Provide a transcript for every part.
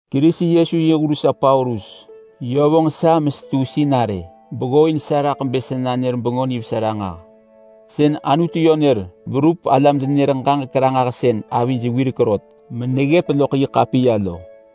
Kerisi Yesu yi hur sa Paulus. Yö vonġ sa mesetu sinarë beggooin sa raḳ bë sa nanër Bengö Nivesa ranġah. Sën Anutu yö nër verup alam-denenër-ġaġek-ranġahsën avij wirek rot meneggëp loḳ yi ḳapiya lo.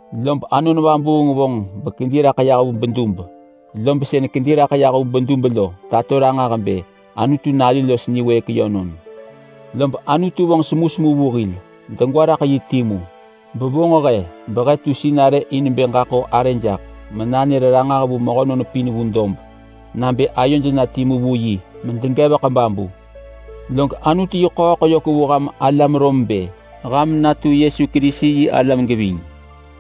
Lob Anon Vabuung vonġ bekedi raḳ yah vu bedub, lob sën kedi raḳ yah vu bedub lo tato ranġah bë Anutu Nalu los niwëëk yönon. Lob Anutu vonġ semusemu vu hil degwa raḳ yi timu. Bevonġ he behe tu sinarë in bë ġaḳo arë jaḳ menanër ranġah vu mehönon pin vu dob nabë ayoj na timu vu yi medegevek babu. Log Anutu yi ḳööḳ yök vu ham alam Rom bë ham natu Yesu Kerisi yi alam geving.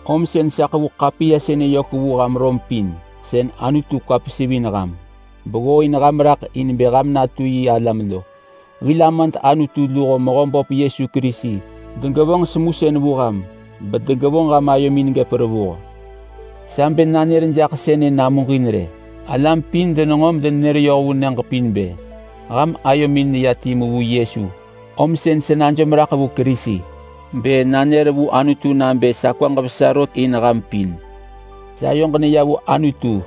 Om sën sa ḳevu ḳapiya sënë yök vu ham Rom pin sën Anutu kwa pesivin ham beggooin ham raḳ in bë ham natu yi alam lo. Hil Amad Anutu luho Mehöböp Yesu Kerisi degevonġ semusën vu ham bedegevonġ ham ayomin gëp revuh. Sa bë nanër jaḳ sënë namuġin rë: Alam pin denġo medenenër yoh vu nyëġ pin bë ham ayomin neya timu vu Yesu, om sën sa najom raḳ vu Kerisi bë nanër vu Anutu nabë sa kwaġ vesa rot in ham pin. Sayoġ neya vu Anutu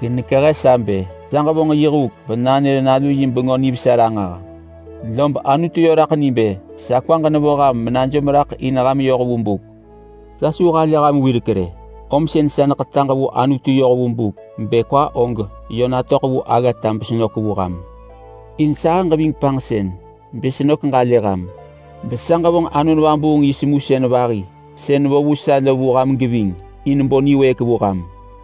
genekehe sa bë sa ġevonġ yi huk benanër Nalu yi Bengö Nivesa ranġah. Lob Anutu yö raḳ ni bë sa kwaġ nevo ham menajom raḳ in ham yoh vu buk. Sa su halë ham wirek rë, om sën sa neḳetaġ vu Anutu yoh vu buk bë kwa og yö natöḳ vu aggata besenök vu ham. In sahëġ ving panġsën bë senök ġalë ham, besa ġevonġ Anon Vabuung yi semusën vahi sën vo vu sa lo vu ham geving in bo niwëëk vu ham.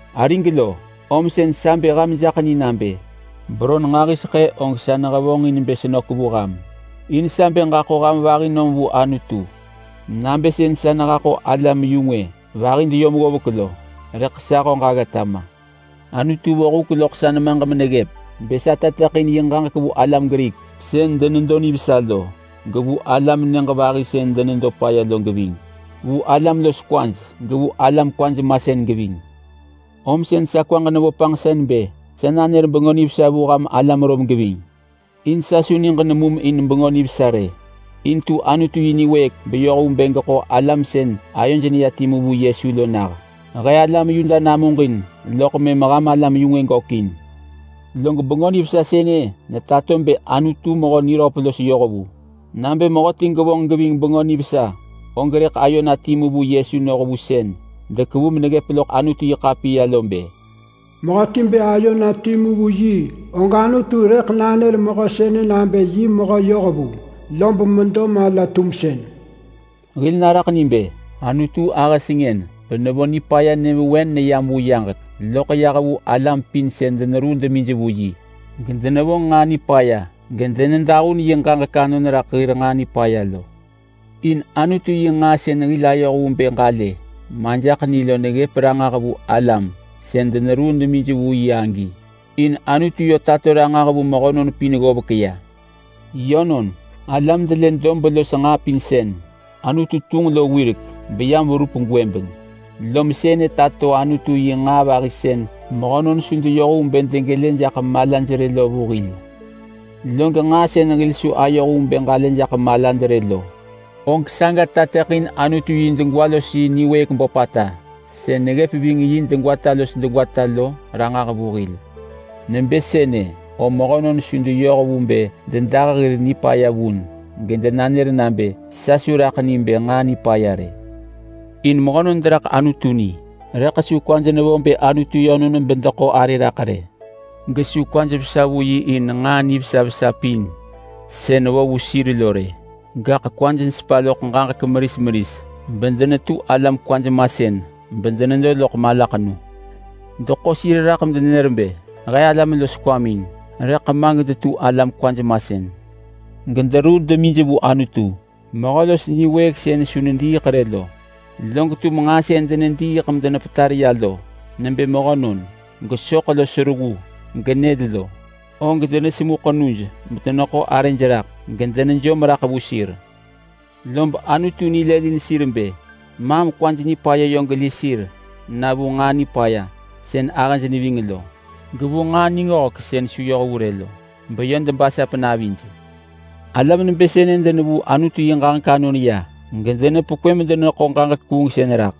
Arig lo, om sën sa bë ham jaḳ ni nabë beron nġahiseḳë og sa nehevonġin bë senök vu ham. In sa bë ġaḳo ham vahi nom vu Anutu nabë sën sa nehaḳo alam-yu-ngwë vahi deyom ggovek lo. Rëḳ sa höġ aggata ma. Anutu vo huk loḳ sa nemaġ meneggëp bë sa tateḳin yi ġaġek vu alam Grik sën denedo nivesa lo, gevu alam nyëġ vahi sën denedo paya lo geving. Vu alam los kwaj, gevu alam kwaj masën geving. Om sën sa kwaġ nevo panġsën bë sa nanër Bengö Nivesa vu ham alam Rom geving. In sa su niġ nemum in Bengö Nivesa rë. In tu Anutu yi niwëëk beyoh vu bë geḳo alam sën ayoj neya timu vu Yesu lo nah. He alam Yuda namuġin, loḳ mëm ham alam-yu-ngwë gökin. Log Bengö Nivesa sënë netato bë Anutu mehö niröp los yohvu. Nabë mehöti gevonġ geving Bengö Nivesa, og rëḳ ayo na timu vu Yesu noh vu sën dekevu meneggëp loḳ Anutu-yi-ḳapiya lo bë, “Mehöti bë ayo na timu vu yi, og Anutu rëḳ nanër mehö sënë nabë yi mehö yohvu, lob medo mala-tumsën.” Hil naraḳ ni bë, Anutu ahë sengën benevo nipaya nyëvewen neyam vu yaġek loḳ yah vu alam pin sën deneruu demij vu yi, gedenevonġ nġaa nipaya medenedahun yi ġaġek anon raḳ hir nġaa nipaya lo. In Anutu yi nġaa sën hil ayoh vu bë ġalë majaḳ ni lo neggëp ranġah vu alam sën deneruu demij vu yi agi. In Anutu yö tato ranġah vu mehönon pin ggovek ya. Yönon, alam delë dob los nġaa pin sën Anutu tunġ lo wirek beyam verup gwëbeng, lom sënë tato Anutu yi nġaa vahi sën mehönon su deyoh vu bë degelë jaḳ malaj rë lo vu hil. Log nġaa sën hil su ayoh vu bë ġalë jaḳ malad rë lo, og saga tateḳin Anutu yi degwa los yi niwëëk böpata sën neggëp ving yi degwata los degwata lo ranġah vu hil. Nebë sënë, om mehönon su deyoh vu bë dedah hir nipaya vun gedenanër nabë, “Sa su raḳ ni bë nġaa nipaya rë!” In mehönon deraḳ Anutu ni rëḳ su kwaj nevo bë Anutu yönon bedeḳo arë raḳ rë. Gesu kwaj vesa vu yi in nġaa nivesa vesa pin sën vo vu sir lo rë. Gaḳ kwaj nesepa loḳ ġaġek meris meris bedenetu alam kwaj masën bedenedo loḳ malaḳenu. Deḳo sir raḳ medenenër bë, “He alam los kwamin!” rëḳ ma gedetu alam kwaj masën. Gederuu demij vu Anutu, mehö los niwëëk sën su nediiḳ rë lo. Log tum nġaa sën denediiḳ medenepetar ya lo nebë mehönon, gesoḳ los reggu genyël lo, og denesemu ḳenuj medeneḳo arëj raḳ medenejom raḳ vu sir. Lob Anutu nilëlin sir bë, maam kwaj nipaya yö geli sir na vu nġaa nipaya sën ahëj neving lo, gevu nġaa ningöhek sën su yoh vu rë lo, beyö debasap navij. Alam nebë sënë denevuu Anutu yi ġaġek anon ya gedenepekwë medeneḳo ġaġek kuungsën raḳ.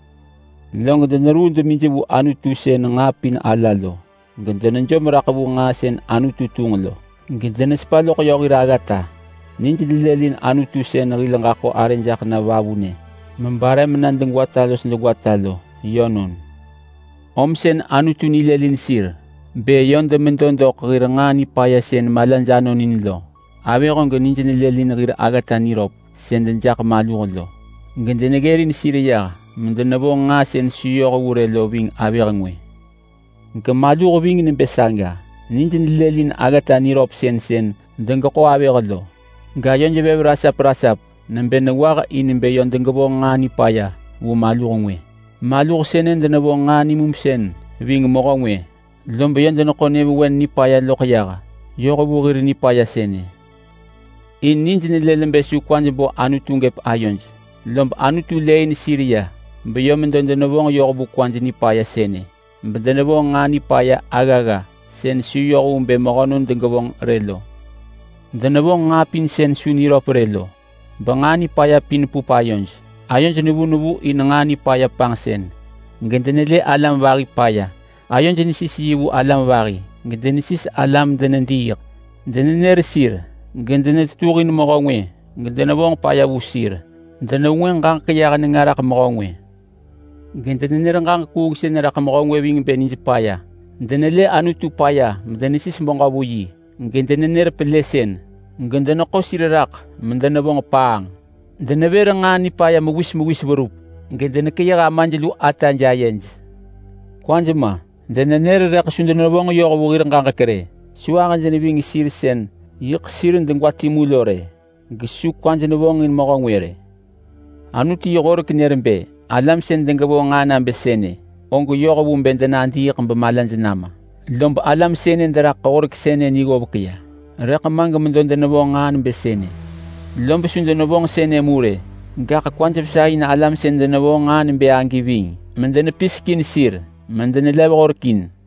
Log deneruu demij vu Anutu sën nġaa pin ala lo, gedenejom raḳ vu nġaa sën Anutu tunġ lo gedenesepa loḳ yö hir aggata. Nij nelëlin Anutu sën hil ġaḳo arë jaḳ na vavunë mebare mena degwata los degwata lo. Yönon. Om sën Anutu nilëlin sir bë yö demedo doḳ hir nġaa nipaya sën malaj anon in lo. Avëh og nij nelëlin hir aggata niröp sën dejaḳ maluh lo, gedeneggërin sir yah medenevonġ nġaa sën su yoh vu rë lo ving avëh ngwë. Gemaluh ving nebë saga. Nij nelëlin aggata niröpsën sën degeḳo avëh lo gayoj vev rasap rasap nebë nengwah in bë yö degevonġ nġaa nipaya vu maluh ngwë. Maluh sënë denevonġ nġaa nimumsën ving mehö ngwë lob yö deneḳo nyëvewen nipaya loḳ yah, yoh vu hir nipaya sënë. In nij nelël bë su kwaj bo Anutu gëp ayoj, lom Anutu lëëin sir ya beyö medo denevonġ yoh vu kwaj nipaya sënë, bedenevonġ nġaa nipaya aggagga sën su yoh vu bë mehönon degevonġ rë lo. Denevonġ nġaa pin sën su niröp rë lo benġaa nipaya pin pup ayoj. Ayoj nevu nevu in nġaa nipaya panġsën gedenelë alam vahi paya. Ayoj nesis yi vu alam vahi ga, denesis alam medenediiḳ. Denenër sir ga, denetetuhin mehö ngwë gedenevonġ paya vu sir. Denevengwënġ ġaġek yah nenga raḳ mehö ngwë ga, denenër ġaġek kuungsën raḳ mehö ngwë ving bë nij paya. Denelë Anutu paya medenesis beġö vu yi ga, denenër pelësën ga, deneḳo sir raḳ medenevonġ paanġ. Denevër nġaa nipaya mewis mewis verup. Gedenekeyëh amaj lu ataj ayej. Kwaj ma! Denenër rëḳ su denevonġ yoh vu hir ġaġek rë. Su ahëj neving sir sën yiḳ sir degwa timu lo rë. Gesu kwaj nevonġin mehö ngwë rë. Anutu yi horek nër nebë alam sën degevonġ nġaa nabë sënë og yoh vu bë denadiiḳ bemalaj nama. Lob alam sënë deraḳ horek sënë ni ggovek ya, rëḳ ma gemedo denevonġ nġaa nebë sënë. Lob su denevonġ sënë mu rë, gaḳ kwaj vesa in alam sën denevonġ nġaa nebë agi ving, medenepisek in sir medenelev horek in.